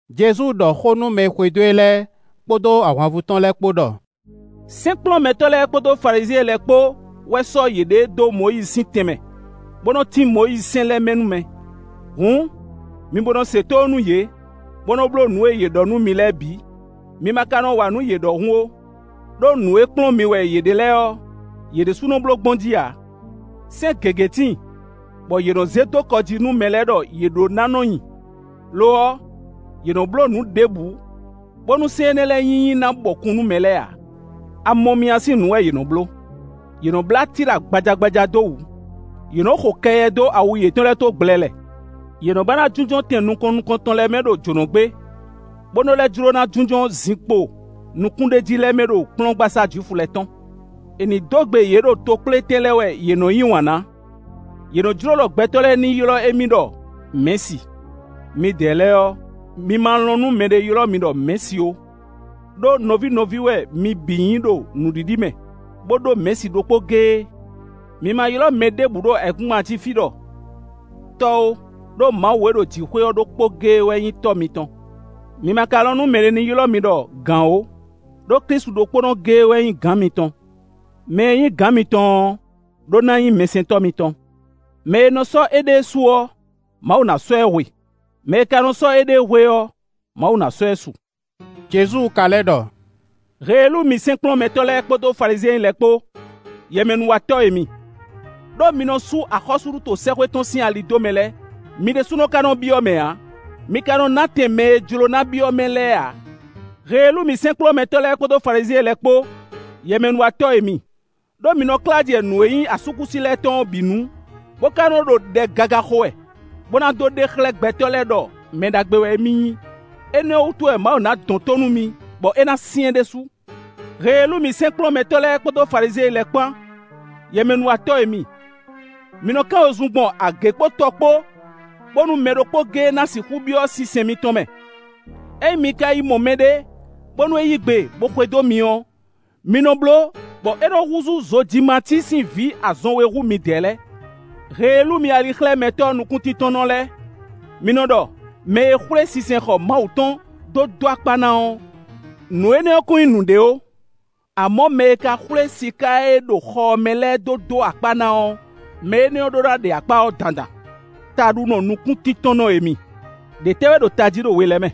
Jezu ɖɔ xó nú mɛ e xwedó e lɛ́ɛ kpódó ahwanvú tɔn lɛ́ɛ kpó ɖɔ: “Sɛ́nkplɔ́nmɛtɔ́ lɛ́ɛ kpódó Falizyɛn lɛ́ɛ kpó wɛ sɔ́ yěɖée ɖó Mɔyízi sín tɛnmɛ, bo nɔ tín Mɔyízi sɛ́n lɛ́ɛ mɛ nú mɛ. Hǔn, mi bo nɔ se tónú nú yě, bó nɔ́ bló nǔ e yě ɖɔ nú mi lɛ́ɛ bǐ; mi ma ka nɔ wa nǔ yě ɖɔhun ó; ɖó nǔ e kplɔ́n mi wɛ yě ɖe lɛ́ɛ ɔ́, yě ɖésú nɔ bló gbɔn jí ǎ. Sɛ́n gěgé tíin, bɔ yě nɔ zé dó kɔ jí nú mɛ lɛ́ɛ ɖɔ yě ɖó ná nɔ nyi; lo ɔ́, yě nɔ bló nǔ ɖěbǔ, bónú sɛ́n énɛ́ lɛ́ɛ sín nyinyi na bɔkun nú mɛ lɛ́ɛ ǎ. A mɔ mì a sín nǔ wɛ yě nɔ bló; yě nɔ blá tíla gbajagbaja dó wǔ; yě nɔ xo kɛyɛ dó awu yětɔn lɛ́ɛ tó gblɛlɛ. Yě nɔ ba ná jínjɔ́n tɛn nukɔn nukɔntɔn lɛ́ɛ mɛ ɖo jǒnɔgbé, bó nɔ lɛ́ jló ná jínjɔ́n zinkpo nukúnɖéjí lɛ́ɛ mɛ ɖo kplɔ́ngbasá Jwifu lɛ́ɛ tɔn. È nǐ dó gbe yě ɖo tokplétɛn lɛ́ɛ wɛ yě nɔ yí wǎn ná. Yě nɔ́ jló ɖɔ gbɛtɔ́ lɛ́ɛ ní ylɔ́ émí ɖɔ: ‘Mɛ̌si.’ Midɛɛ lɛ́ɛ ɔ́, mi ma lɔn nú mɛɖé ylɔ́ mi ɖɔ: ‘Mɛ̌si’ ó, ɖó nɔví nɔví wɛ mi bǐ nyí ɖo nǔɖiɖi mɛ, bó ɖó Mɛ̌si ɖokpó géé. Mi ma ylɔ́ mɛ ɖěbǔ ɖo ayǐkúngban jí fí ɖɔ: ‘Tɔ́’ ó, ɖó Mawu e ɖo jǐxwé ɔ́ ɖokpónɔ géé wɛ nyí Tɔ́ mitɔn. Mi ma ka lɔn nú mɛɖé ní ylɔ́ mi ɖɔ: ‘Gǎn’ ó, ɖó Klísu ɖokpónɔ géé wɛ nyí Gǎn mitɔn. Mɛ e nyí gǎn mitɔn ɔ́ ɖó ná nyí mɛsɛntɔ́ mitɔn. Mɛ e nɔ sɔ́ éɖée su ɔ́, Mawu ná sɔ́ ɛ hwe; mɛ e ka nɔ sɔ́ éɖée hwe ɔ́, Mawu ná sɔ́ ɛ su.” Jezu ka lɛ́ ɖɔ: “Heelú mi sɛ́nkplɔ́nmɛtɔ́ lɛ́ɛ kpódó Falizyɛn lɛ́ɛ kpó, yɛmɛnúwatɔ́ e mi! Ɖó mi nɔ sú axɔ́súɖuto sɛ́xwé tɔn sín ali dó mɛ lɛ́ɛ, mi ɖésú ka nɔ byɔ́ ɛ mɛ ǎ; mi ka nɔ ná tɛn mɛ e jló ná byɔ́ ɛ mɛ lɛ́ɛ ǎ. [ “Heelú mi sɛ́nkplɔ́nmɛtɔ́ lɛ́ɛ kpódó Falizyɛn lɛ́ɛ kpó, yɛmɛnúwatɔ́ e mi! Ɖó mi nɔ klá jɛ nǔ e nyí asúkúsi lɛ́ɛ tɔn ɔ́ bǐ nu, bó ka nɔ ɖo ɖɛ gaga xo wɛ, bó ná dó ɖe xlɛ́ gbɛtɔ́ lɛ́ɛ ɖɔ mɛ ɖagbe wɛ émí nyí. Énɛ́ ɔ́ wútu wɛ Mawu ná dɔn tó nú mi bɔ é ná syɛ́n ɖésú.] “Heelú mi sɛ́nkplɔ́nmɛtɔ́ lɛ́ɛ kpódó Falizyɛn lɛ́ɛ kpán, yɛmɛnúwatɔ́ e mi! Mi nɔ kán wezun gbɔn agě kpó tɔ kpó, bónú mɛ ɖokpó géé ná sixú byɔ́ sinsɛn mitɔn mɛ. Ényí mi ka yi mɔ mɛɖé, bónú é yí gbe, bó xwedó mi ɔ́, mi nɔ bló, bɔ é nɔ húzú zojimací sín vǐ azɔn we hú midɛɛ lɛ́ɛ. “Heelú mi alixlɛ́mɛtɔ́ nukúntíntɔ́nnɔ lɛ́ɛ! Mi nɔ ɖɔ: ‘Mɛ e xwlé sinsɛnxɔ Mawu tɔn dó dó akpá ná ɔ́, nǔ énɛ́ ɔ́ kún nyí nǔɖé ó; amɔ̌, mɛ e ka xwlé siká e ɖo xɔ ɔ́ mɛ lɛ́ɛ dó dó akpá ná ɔ́, mɛ énɛ́ ɔ́ ɖó ná ɖe akpá ɔ́ dandan.’ Taɖunɔ nukúntíntɔ́nnɔ e mi! Ɖě tɛ́ wɛ ɖo tají ɖo we lɛ́ɛ mɛ?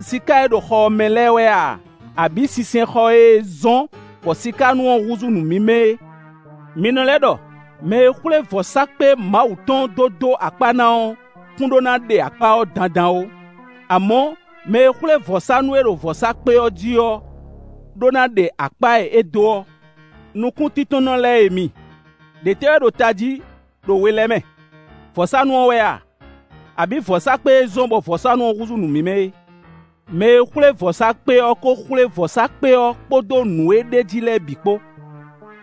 Siká e ɖo xɔ ɔ́ mɛ lɛ́ɛ wɛ a, abǐ sinsɛnxɔ e zɔ́n bɔ sikánú ɔ́ húzú nǔ mímɛ́ é? Mi nɔ lɛ́ ɖɔ: mɛ e xwlé vɔ̌sákpe Mawu tɔn dó dó akpá ná ɔ́ kún ɖó ná ɖe akpá ɔ́ dandan ó; amɔ̌, mɛ e xwlé vɔ̌sánú e ɖo vɔ̌sákpe ɔ́ jí ɔ́ ɖó ná ɖe akpá e é dó ɔ́. Nukúntíntɔ́nnɔ lɛ́ɛ e mi, ɖě tɛ́ wɛ ɖo tají ɖo we lɛ́ɛ mɛ? Vɔ̌sánú ɔ́ wɛ a? Abǐ vɔ̌sákpe e zɔ́n bɔ vɔ̌sánú ɔ́ húzú nǔ mímɛ́ é? Mɛ e xwlé vɔ̌sákpe ɔ́ ko xwlé vɔ̌sákpe ɔ́ kpódó nǔ e ɖ'é jí lɛ́ɛ bǐ kpó.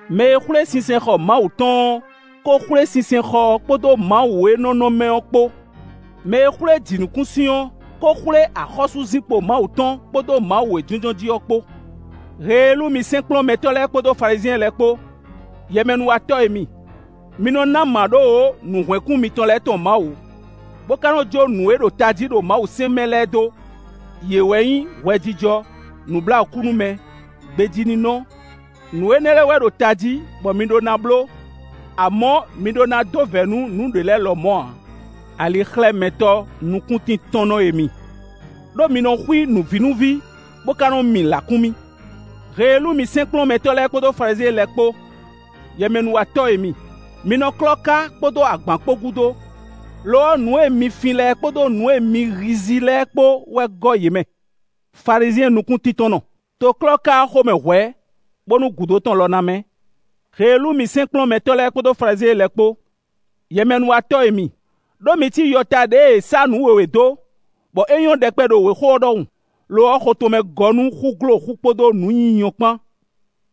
Mɛ e xwlé sinsɛnxɔ Mawu tɔn ɔ́, ko xwlé sinsɛnxɔ ɔ́ kpódó Mawu e nɔ nɔ mɛ ɔ́ kpó. Mɛ e xwlé jǐnukúnsin ɔ́ ko xwlé axɔ́súzinkpo Mawu tɔn, kpódó Mawu e jínjɔ́n jí ɔ́ kpó. “Heelú mi sɛ́nkplɔ́nmɛtɔ́ lɛ́ɛ kpódó Falizyɛn lɛ́ɛ kpó, yɛmɛnúwatɔ́ e mi! Mi nɔ ná mǎɖówǒ nǔhwɛ́nkún mitɔn lɛ́ɛ tɔn Mawu, bó ka nɔ jó nǔ e ɖo tají ɖo Mawusɛ́n mɛ lɛ́ɛ dó. Yě wɛ nyí: Hwɛjijɔ, nǔbláwǔkúnúmɛ, gbejíninɔ; nǔ énɛ́ lɛ́ɛ wɛ ɖo tají bɔ mi ɖó ná bló; amɔ̌, mi ɖó ná dó vɛ̌ nú nǔɖé lɛ́ɛ lɔmɔ̌ ǎ. Alixlɛ́mɛtɔ́ nukúntíntɔ́nnɔ e mi! Ɖó mi nɔ xwí nǔvínúví, bó ka nɔ mi lǎkúnmí. “Heelú mi sɛ́nkplɔ́nmɛtɔ́ lɛ́ɛ kpódó Falizyɛn lɛ́ɛ kpó! Yɛmɛnúwatɔ́ e mi! Mi nɔ klɔ́ ká kpódó agbǎn kpó gúdo; lo ɔ́, nǔ e mi fin lɛ́ɛ kpódó nǔ e mi hízí lɛ́ɛ kpó wɛ gɔ́ yě mɛ. Falizyɛn nukúntíntɔ́nnɔ! To klɔ́ ká ɔ́ xomɛ hwɛ̌, bónú gúdo tɔn lɔ na mɛ́. “Heelú mi sɛ́nkplɔ́nmɛtɔ́ lɛ́ɛ kpódó Falizyɛn lɛ́ɛ kpó! Yɛmɛnúwatɔ́ e mi! Ɖó mi cí yɔta ɖěe è sá nǔ wěwé dó, bɔ é nyɔ́ ɖɛkpɛ ɖo wěxo ɔ́ ɖɔhun. Lo ɔ́, xo tɔn mɛ gɔ́ nú xúgloxú kpódó nǔ nyinyɔ kpán.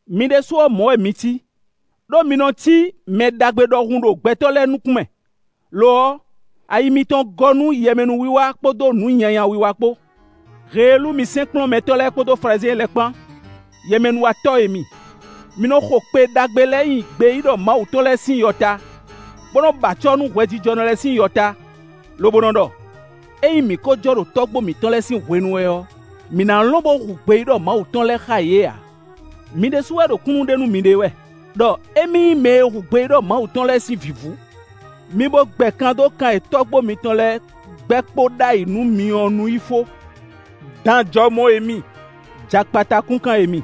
Mi ɖésú ɔ́, mɔ̌ wɛ mi cí. Ɖó mi nɔ cí mɛ ɖagbe ɖɔhun ɖo gbɛtɔ́ lɛ́ɛ nukún mɛ, lo ɔ́, ayi mitɔn gɔ́ nú yɛmɛnúwiwa kpódó nǔ nyanya wiwa kpó.” “Heelú mi sɛ́nkplɔ́nmɛtɔ́ lɛ́ɛ kpódó Falizyɛn lɛ́ɛ kpán; yɛmɛnúwatɔ́ e mi! Mi nɔ xo kpe ɖagbe lɛ́ɛ nyi gbeyíɖɔ Mawu tɔn lɛ́ɛ sín yɔta, bó nɔ́ ba acɔ́ nú hwɛjijɔnɔ lɛ́ɛ sín yɔta; lobo nɔ ɖɔ: ‘Ényí mǐ ko jɔ ɖo tɔ́gbó mǐtɔn lɛ́ɛ sín hwenu wɛ ɔ́, mǐ ná lɔn bo hu gbeyíɖɔ Mawu tɔn lɛ́ɛ xá yě ǎ.’ Mi ɖésú wɛ ɖo kúnnu ɖe nú miɖée wɛ, ɖɔ émí nyí mɛ e hu gbeyíɖɔ Mawu tɔn lɛ́ɛ sín vǐvú. Mi bo gbɛ kan dó kan e tɔ́gbó mitɔn lɛ́ɛ gbɛ kpo ɖ'ayǐ nú mi ɔ́ nu yi fó. Dan jɔmɔ e mi! Jakpata kúnkan e mi!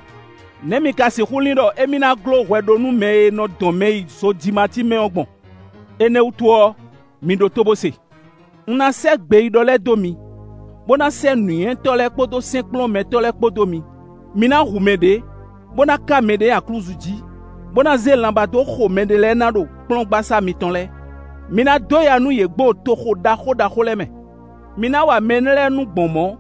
Nɛ̌ mi ka sixú lin ɖɔ émí ná gló hwɛɖónúmɛ e nɔ dɔn mɛ yi zojimací mɛ ɔ́ gbɔn? Énɛ́ ɔ́ wútu ɔ́, mi ɖótó bó se: ‘Un ná sɛ́ gbeyíɖɔ lɛ́ɛ dó mi, bó ná sɛ́ nǔnywɛ́tɔ́ lɛ́ɛ kpódó sɛ́nkplɔ́nmɛtɔ́ lɛ́ɛ kpó dó mi. Mi ná hu mɛ ɖě, bó ná ká mɛ ɖě nyi aklúzu jí, bó ná zé lanbá dó xo mɛɖé lɛ́ɛ ná ɖo kplɔ́ngbasá mitɔn lɛ́ɛ. Mi ná dó ya nú yě gbɔn toxo ɖaxó ɖaxó lɛ́ɛ mɛ.’ Mi ná wa mɛ énɛ́ lɛ́ɛ nú gbɔn mɔ̌,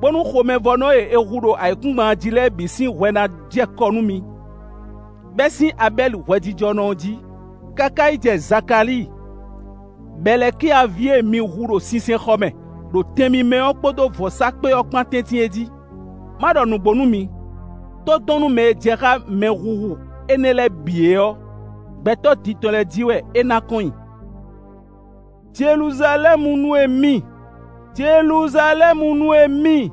bónú xomɛvɔ́nɔ e è hu ɖo ayǐkúngban jí lɛ́ɛ bǐ sín hwɛ ná jɛ kɔ nú mi, bɛ́ sín Abɛ́li hwɛjijɔnɔ ɔ́ jí, káká yi jɛ Zakalíi, Bɛlɛ́kya ví e mi hu ɖo sinsɛnxɔ mɛ, ɖo tɛn mímɛ́ ɔ́ kpódó vɔ̌sákpe ɔ́ kpán tɛ́ntin é jí. Má ɖɔ nǔgbó nú mi: tódɔnnúmɛ e jɛ xá mɛhuhu énɛ́ lɛ́ɛ bǐ é ɔ́, gbɛtɔ́ din tɔn lɛ́ɛ jí wɛ é ná kɔn nyi. “Jeluzalɛ́munu e mi, Jeluzalɛ́munu e mi,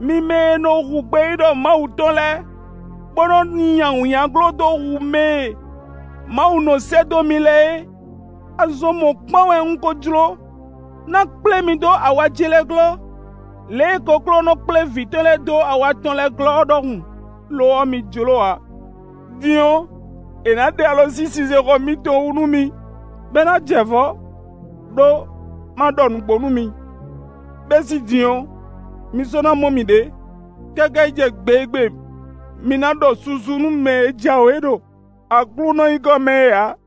mi mɛ e nɔ hu gbeyíɖɔ Mawu tɔn lɛ́ɛ, bo nɔ nyi awǐnnyaglo dó hu mɛ e Mawu nɔ sɛ́ dó mi lɛ́ɛ é! Azɔn mɔ̌kpán wɛ un ko jló ná kplé mi dó awa ce lɛ́ɛ glɔ́, lě e kokló nɔ kplé vǐ tɔn lɛ́ɛ dó awa tɔn lɛ́ɛ glɔ́ ɔ́ ɖɔhun. Lo ɔ́, mi jló ǎ. Din ɔ́, è nǎ ɖe alɔ sín sinsɛnxɔ mitɔn wú nú mi, bɔ é ná jɛ vɔ̌. Ɖó má ɖɔ nǔgbó nú mi: bɛ́ sín din ɔ́, mi sɔ́ ná mɔ mì ɖě káká yi jɛ gbe e gbe mi na ɖɔ susu nú mɛ e jǎwe ɖo Aklúnɔ nyǐkɔ mɛ é ǎ.”